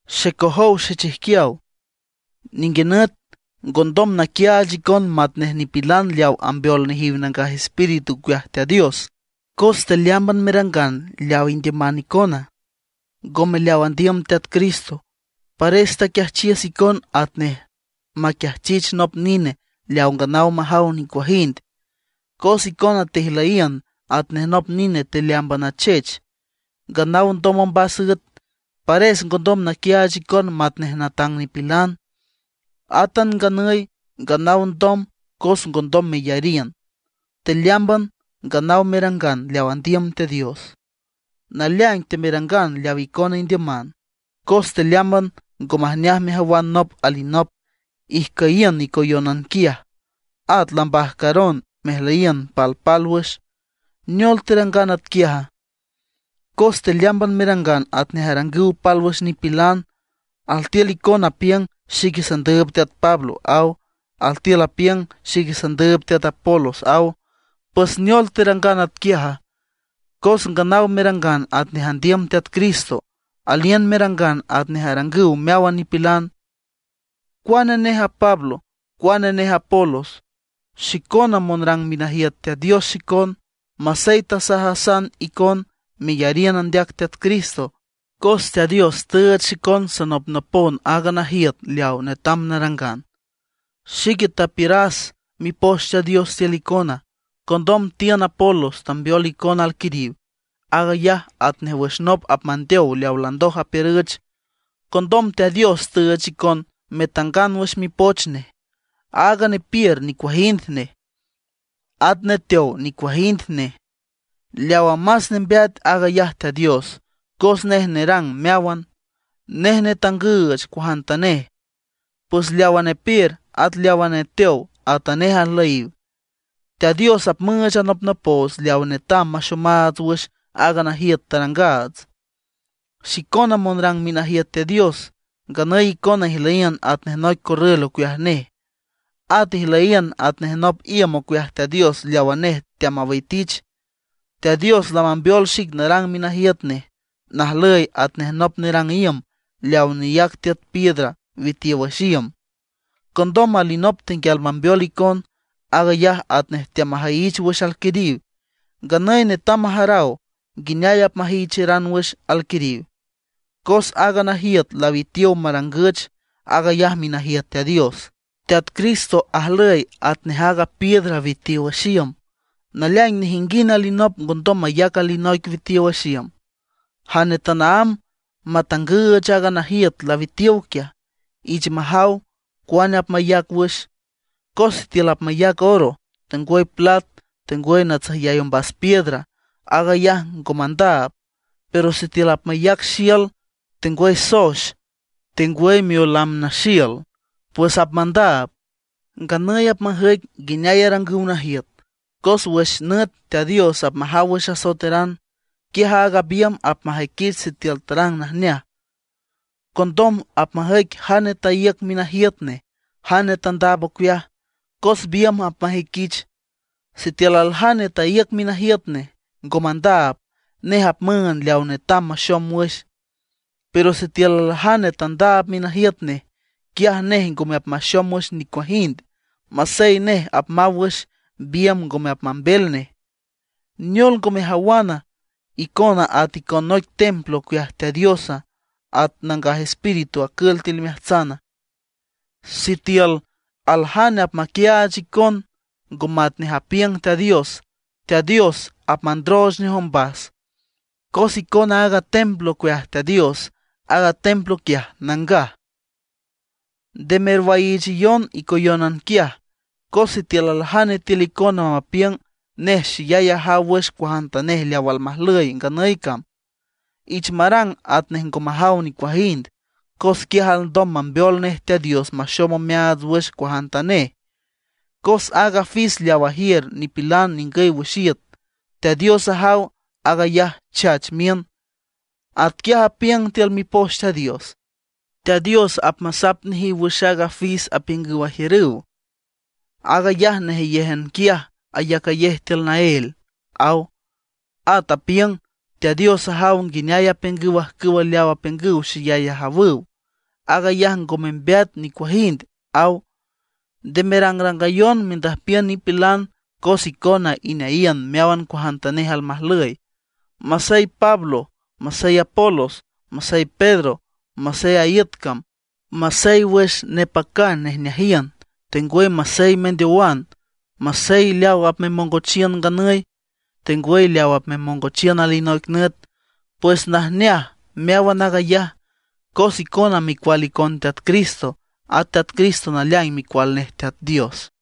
Xecojow xechijquiaw, ninguinüt ngondom naquiaach icon matnej nipilan leaw ambeol nejiw Nangaj Espíritu ocueaj Teat Dios, cos tealeámban merangan leaw indiüman icona, ngome leaw andiüm Teat Cristo. Pares taquiajchiüs icon atnej maquiajchich nop nine leaw nganaw majaw nicuajind. Cos icona tejlüyiün atnej nop nine tealeámban achech, nganaw ndom ombas üet, pares ngondom naquiaach icon matnej natang nipilan. Átan nganüy, nganaw ndom cos ngondom meyariün. Tealeámban nganaw merangan leaw andiüm Teat Dios; naleaing temerangan leaw icona indiüman. Cos tealeámban ngo majneaj mejawan nop alinop, ijcüyiün icoyónan quiaj, at lambajcaron mejlüyiün palpálwüx. ¿Neol terangan atquiaja? Cos tealeámban merangan atnej arangüw pálwüx nipilan. Altiül icona apiüng: “Xique sandüüb teat Pablo”, aw. Altiül apiüng: “Xique sandüüb teat Apolos”, aw. ¿Pues neol terangan atquiaja? Cos nganaw merangan atnej andiüm Teat Cristo; aliün merangan atnej arangüw meáwan nipilan. ¿Cuane neje a Pablo? ¿Cuane neje Apolos? Xicona monrang minajiüt Teat Dios xicon, masey tasajasan icon meyariün andeac Teat Cristo; cos Teat Dios tüüch xicon sanopnopon aaga najiüt leaw netam narangan. Xique tapiüras Mipoch Teat Dios tiül icona; condom tiün Apolos tambeol icon alquiriw. Aag ayaj atnej wüx nop apmateow leaw landoj apiürüch. Condom Teat Dios tüüch icon metangan wüx Mipoch Nej. Aaga nepiür nicuajind nej; at neteow nicuajind nej. Leawa más nembeat, aag ayaj Teat Dios, cos nej nerang meáwan, nej netangüch cuajantanej. Pues leawa nepiür, at leawa neteow atanej ajlüyiw. Teat Dios apmüüch anopnopoots leaw netam maxomaats wüx aaga najiüt tarangaats. Xicona monrang minajiüt Teat Dios, nganüy icona ijlüyiün atnej noic corrül ocueaj nej. At ijlüyiün atnej nop iüm ocueaj Teat Dios leaw nej teamawitich. Teat Dios lamambeol xic narang minajiüt nej, najlüy atnej nop nerang iüm leawa neyac tiüt piedra witiow wüx iüm. Condom alinop tenguial mambeol icon, aag ayaj atnej teamajüyich wüx alquiriw. Nganüy netam majaraw nguineay apmajüyicheran wüx alquiriw. Cos aaga najiüt lawitiow marangüch, aag ayaj minajiüt Teat Dios. Teat Cristo ajlüy atnej aaga piedra witiow wüx iüm. Naleaing nejinguind alinop ngondom mayac alinoic witiow wüx iüm. Jane tanaámb matangüüch aaga najiüt lawitiow quiaj, ich majaw cuane apmayac wüx. Cos sitiül apmayac oro, tengwüy plat, tengwüy natsüjyay ombas piedra, aag ayaj ngo mandaab. Pero sitiül apmayac xiül, tengwüy soex, tengwüy miolam naxiül, pues apmandaab. Nganüy apmajüic nguineay arangüw najiüt, cos wüx nüt Teat Dios apmajaw wüx asoeteran, quiaj aaga biümb apmajüiquich sitiül tarang najneaj. Condom apmajüic jane taíüc minajiüt nej, jane tandaab ocueaj, cos biümb apmajüiquich. Sitiül aljane taíüc minajiüt nej, ngo mandaab, nej apmüünd leaw netam maxom wüx. Pero sitiül aljane tandaab minajiüt nej, quiaj nej ngome apmaxom wüx nicuajind; masey nej apmaw wüx, biümb ngome apmambel nej. ¿Neol ngo mejawana, icona at icon noic templo ocueaj Teat Dios, at Nangaj Espíritu acül tiül imeajtsana? Sitiül aljane apmaquiaach icon ngo matnej apiüng Teat Dios, Teat Dios apmandrooch nej ombas, cos icona aaga templo ocueaj Teat Dios, aaga templo quiaj nangaj. Nde merwaiichayon icoyónan quiaj; cos sitiül aljane tiül icona mapiüng nej xeyay ajaw wüx cuajantanej leaw almajlüy nganüy cam, ich marang atnej ngo majaw nicuajind, cos quiaj alndom mambeol nej Teat Dios maxom omeaats wüx cuajantanej. Cos aaga fis leaw ajiür nipilan ningüy wüx iüt, Teat Dios ajaw aag ayaj chach miün. Atquiaj apiüng tiül Mipoch Teat Dios: “Teat Dios apmasap nejiw wüx aaga fis apiüngüw ajiürüw, aag ayaj nejeyéjan quiaj ayacayej tiül naél”, aw. At apiüng: “Teat Dios ajaw nguineay apiüngüw ajcüw leaw apiüngüw xeyay ajawüw, aag ayaj ngo membeat nicuajind”, aw. Nde merangrangayon mendüjpiün nipilan cos icona ineayiün meáwan cuajantanej almajlüy. Masey Pablo, masey Apolos, masey Pedro, masey a iüt cam, masey wüx nepacan nejneajiün, tengwüy masey mendeowan, masey leaw apmemongochiün nganüy, tengwüy leaw apmemongochiün alinoic nüt; pues najneaj meáwan aag ayaj. Cos icona micual icon Teat Cristo, at Teat Cristo naleaing Micual nej Teat Dios.